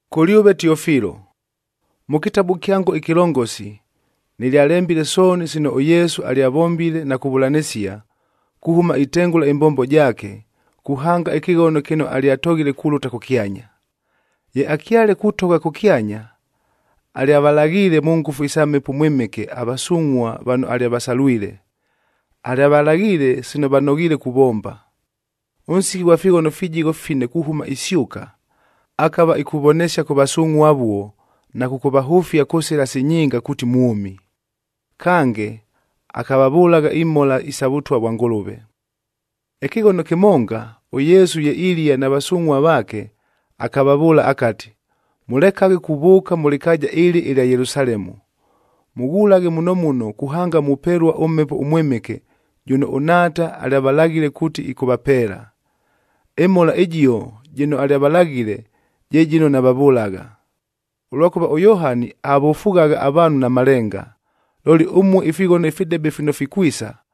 Kʉlyʉve Tiofilo, mʉ kɨtabu kyango ɨkɨlongosi,a nɨlyalembile sooni sino ʉYesu alyavombile na kuvʉlanɨsia, kuhʉma itengʉla ɨmbombo jaake, kuhanga ɨkɨghono kɨno alyatoghile kulʉta kʉkyanya. Ye akyale kutogha kʉkyanya, alyavalaghiile mʉ ngʉfu isa Mhepo ʉMwɨmɨke avasungʼhuab vano alyavasalwile. Alyavalaghiile sino vanoghiile kuvomba. Ʉnsiki ghwa fighono fijigho fine kuhʉma isyʉka, akava ikuvonesia kʉ vasungʼhua avuo na kʉkʉvahʉfia kʉ sɨla si nyinga kuuti mwʉmi. Kange, akavavʉlagha imhola isa Vʉtwa vwa Ngʉlʉve. Ɨkɨghono kɨmonga, ʉYesu ye ilia na vasungʼhua vaake, akavavʉʉla akati, “Mʉlekaghe kuvʉʉka mʉ lɨkaaja ɨlɨ ɨlya Yelusalemu, mʉghulaghe muno muno, kuhanga mupelua ʉMhepo ʉMwɨmɨke jʉno ʉNhaata alyavalaghile kuuti ɨkʉvapeela. Ɨmhola ɨjio jɨno alyavalaghile, je jɨno navavʉlagha. Ʉlwakʉva ʉYohani avofughagha avaanhu na malenga, looli ʉmue ifighono ifidebe fino fikwisa,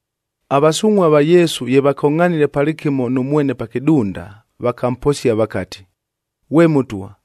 Avasungʼhua va Yesu ye vakongʼhanile palɨkɨmo nʉ mwene pa kɨdunda, vakamposia vakati, “Ghwe Mʉtwa,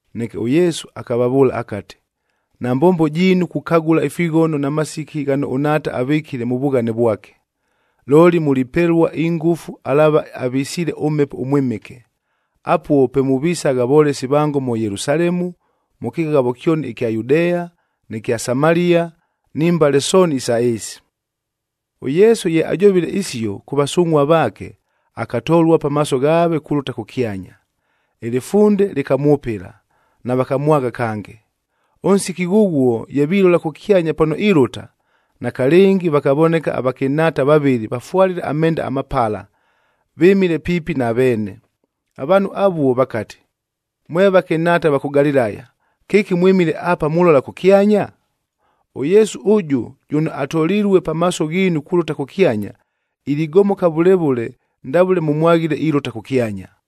Neke ʉYesu akavavʉʉla akati, “Nambombo jiinu kukagʉla ifighono na masiki ghano ʉNhaata avɨkile mʉ vughane vwake. Looli mulipelua ingʉfu alaava avisiile ʉMhepo ʉMwɨmɨke. Apuo pe muvisagha volesi vango mʉ Yelusalemu, mʉ kɨghavo kyoni ɨkya Yudea, nɨ kya Samalia, ni mbale sooni isa ɨɨsi.” ɄYesu ye ajovile isio kʉ vasungʼhua vaake, akatolua pamaaso ghaave kulʉta kʉkyanya. Ɨlɨfunde lɨkamwʉpɨla, navakamwagha kange. Ʉnsiki ghʉghuo ye vilola kʉkyanya pano ilʉta, nakalɨngi vakavoneka avakɨnhaata vavɨlɨ vafwalile amenda amapala, vɨmile piipi na veene. Avaanhu avuo vakati, “Mwe vakɨnhaata va kʉ Galilaya, kɨki mwɨmile apa mulola kʉkyanya? ɄYesu ʉjʉ jʉno atolilue pamaaso ghiinu kulʉta kʉkyanya, iligomoka vʉle vʉle ndavʉle mʉmwaghile ilʉta kʉkyanya.”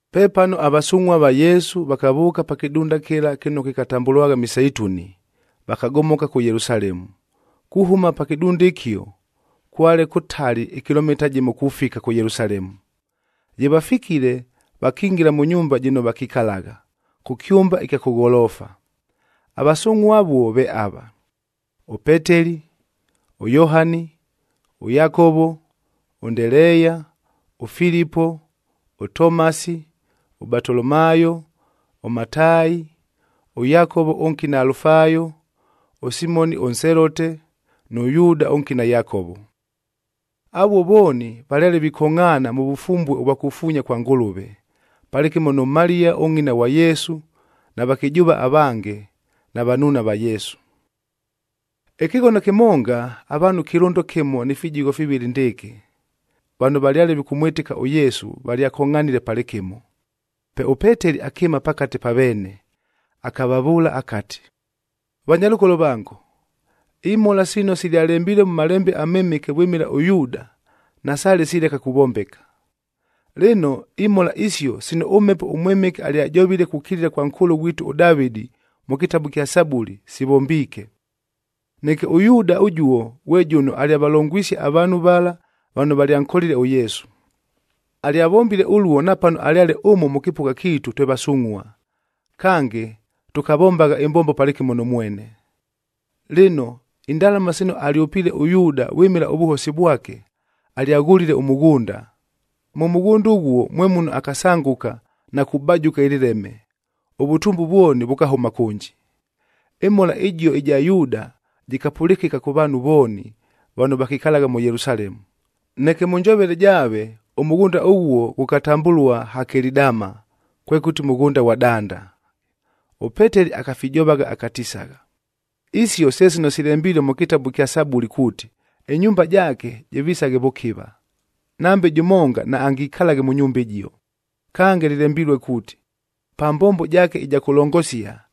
Pepano avasungʼhua va Yesu vakavʉʉka pa kɨdunda kɨla kɨno kɨkatambʉlwagha Miseituni,e vakagomoka kʉ Yelusalemu. Kuhʉma pa kɨdunda ɨkio, kwale kʉtali ɨkilomita jɨmof kufika kʉ Yelusalemu. Ye vafikile, vakingila mʉ nyumba jɨno vakikalagha, kʉ kyʉmba ɨkya kʉ gholoofa. Avasungʼhua avuo ve ava: ʉPeteli, ʉYohani, ʉYakovo, ʉNdeleeya, ʉFilipo, ʉTomasi, ʉBatolomaayo, ʉMataayi, ʉYakovo ʉnkina Alufaayo, ʉSimoni ʉNselote,g nʉ Yuuda ʉnkina Yakovo. Avuo vooni valyale vikongʼhaana mʉ vʉfumbue ʉvwa kufuunya kwa Ngʉlʉve, palɨkɨmo nʉ Maliya ʉngʼina ghwa Yesu, na vakɨjʉʉva avange, na vanuuna va Yesu. Ɨkɨghono kɨmonga, avaanhu kɨlʉndo kɨmo ni fijigho fivɨlɨ ndɨɨkɨ, vano valyale vikʉmwɨtɨka ʉYesu valyakongʼhanile palɨkɨmo. Pe ʉPeteli akɨɨma pakate pa veene, akavavʉʉla akati, “Vanyalʉkolo vango, imhola sino silyalembilue mʉ Malembe aMɨmɨke vwɨmɨla ʉYuuda, nasaale sileka kuvombeka. Lɨno, imhola isio sino ʉMhepo ʉMwɨmɨke alyajovile kukilila kwa nkʉʉlʉ ghwitu ʉDavɨdih mʉ kɨtabu ɨkya Sabuli, sivombiike. Neke ʉYuuda ʉjuo ghwe jʉno alyavalongwisie avaanhu vala vano valyankolile ʉYesu. Alyavombile ʉluo napano alyale ʉmo mʉ kɨpʉgha kiitu twe vasungʼhua, kange tʉkavombagha ɨmbombo palɨkɨmo nʉ mwene.” Lɨno, indalama sino alyʉpiile ʉYuuda vwɨmɨla ʉvʉhosi vwake, alyaghʉlile ʉmʉghʉnda.i Mʉ mʉghʉnda ʉghuo mwe muno akasangʉka na kubajʉka ɨlɨleme, ʉvʉtumbu vwoni vʉkahʉma kʉnji. Ɨmhola ɨjio ɨja Yuuda jɨkapʉlɨkɨka kʉ vaanhu vooni vano vakikalagha mʉ Yelusalemu. Neke mʉ njovele jaave,j ʉmʉghʉnda ʉghuo ghʉkatambʉlua Hakeli Dama, kwekʉti Mʉghʉnda ghwa Danda. ɄPeteli akafijovagha akatisagha, “Isio se sino silembilue mʉ kɨtabu ɨkya Sabuli kuuti, ‘Ɨnyumba jaake jɨvisaghe vʉkɨva, nambe jʉmonga naangikalaghe mʉ nyumba ɨjio.’k “Kange, lɨlembilue kuuti, ‘Pa mbombo jaake ɨja kʉlongosia,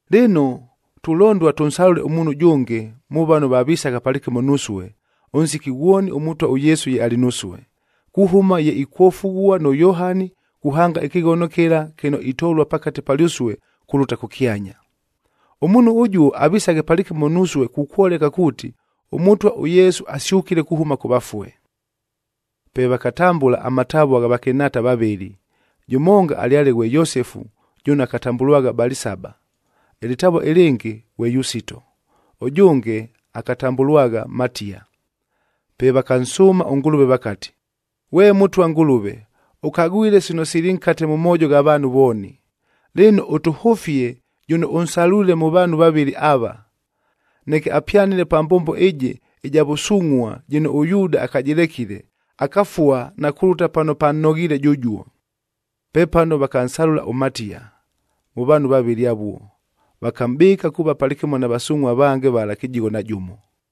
“Lɨno, tulondua tʉnsalʉle ʉmuunhu ʉjʉnge, mʉ vano vavisagha palɨkɨmo nusue, ʉnsiki ghwoni ʉMʉtwa ʉYesu ye alɨ nusue, kuhʉma ye ikwofughua nʉ Yohani kuhanga ɨkɨghono kɨla kɨno itolua pakate palyʉsue kulʉta kʉkyanya. Ʉmuunhu ʉjuo avisaghe palɨkɨmo nusue kukwoleka kuuti, ʉMʉtwa ʉYesu asyʉkile kuhʉma kʉ vafue.” Pe vakatambʉla amatavua gha vakɨnhaata vavɨlɨ. Jʉmonga alyale ghwe Yosefu jʉno akatambʉlwagha Balisaba, ɨlɨtavua ɨlɨngɨ ghwe Yusito, ʉjʉnge akatambʉlwagha Matiya. Pe vakansʉʉma ʉNgʉlʉve vakati, “Ghwe Mʉtwa Ngʉlʉve, ʉkagwile sino sili nkate mʉ moojo gha vaanhu vooni. Lɨno, ʉtʉhʉfie jʉno ʉnsalwile mʉ vaanhu vavɨlɨ ava, neke apyanɨle pa mbombo ɨjɨ ɨja vʉsungʼhua jɨno ʉYuuda akajɨlekile, akafua na kulʉta pano pannoghiile jʉjuo.” Pepano vakansalʉlam ʉMatiya mʉ vaanhu vavɨlɨ avuo, vakamʼbɨɨka kuuva palɨkɨmo na vasungʼhua avange vala kɨjigho na jʉmo.